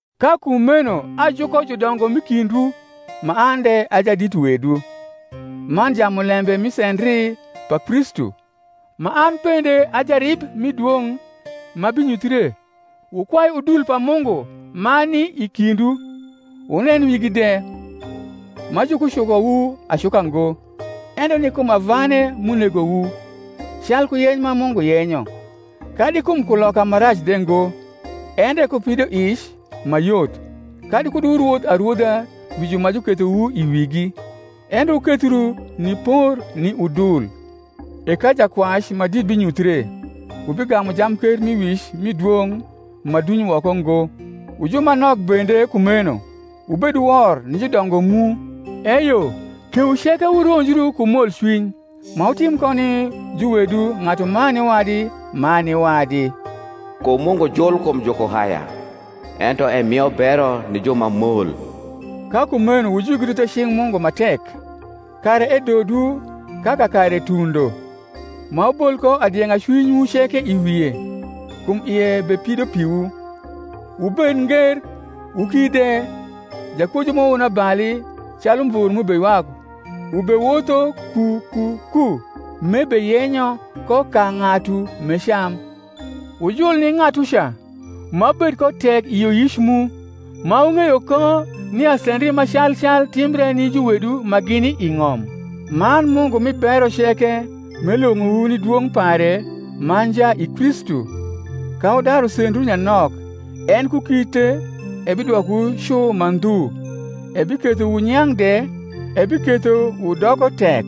Ka kumeno ajuko judongo m’i kindwu, ma an de a jadit wedwu, man jamulembe mi sendri pa Kristu, ma an bende a jarib mi dwong’ ma binyuthre: Wukwai udul pa Mungu ma ni i kindwu, wunen wigi de, ma jukucukowu acuka ngo, ento ni kum avane m’unegowu, calku yeny ma Mungu yenyo; kadi kum kuloka ma rac de ngo, endre ku pidoic ma yot; kadi kud wurwodh arwodha wi ju ma jukethowu i wigi, endre wukethru ni por ni udul. E ka Jakwac ma dit binyuthie, wubigamu jamkermiwic mi dwong’ ma duny woko ngo. Wu ju ma nok bende, kumeno, wubed wor ni judongo mu. Eyo, kewu ceke wuronjrn ku molcwiny, ma wutim ko ni juwedwu ng’atuman ni wadi man ni wadi: kum Mungu jul kum jukuhaya, ento emio bero ni ju ma mol. Ka kumeno wujwigrn the cing’ Mungu ma tek, kara edodwu ka kakare tundo; ma wubol ko adieng’a cwinywu ceke i wie, kum ie bepido piwu. Wubed nger, wuki de; jakwojwu ma wonabali, calu umvor m’ubeywak, ubewotho ku ku ku, m’ebeyenyo ko ka ng’atu m’ecam: wujul ni ng’atuca ma wubed ko tek i yioyic mu, ma wung’eyo ko nia sendri ma calcal timbre ni juwedwu ma gini i ng’om. Man Mungu mi bero ceke, m’elwong’owu ni dwong’ pare ma nja i Kristu, ka wudaru sendru nyanok, en ku kite ebidwokowu cu ma ndhu, ebiketho wunyang’ de, ebiketho wudoko tek.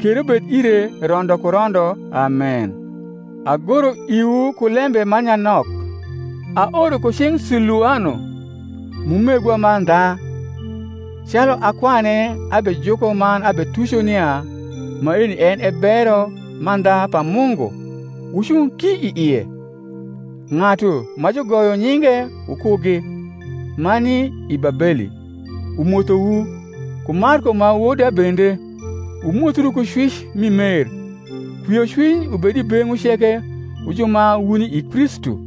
Kero bed ire rondo ku rondo. Amen. Agoro iwu ku lembe ma nyanok, aoro ku cing’ Siluano, m’umegwa mandha, calu akwane abejuko man abetuco nia maeni en e bero mandha pa Mungu: wucung ki i ie. Ng’atu ma jugoyo nyinge wukugi, ma ni i Babeli, umothowu; ku Marko ma woda bende. Wumothru ku cwic mi mer. Kwiocwiny ubed i beng’wu ceke wu ju ma wuni i Kristu.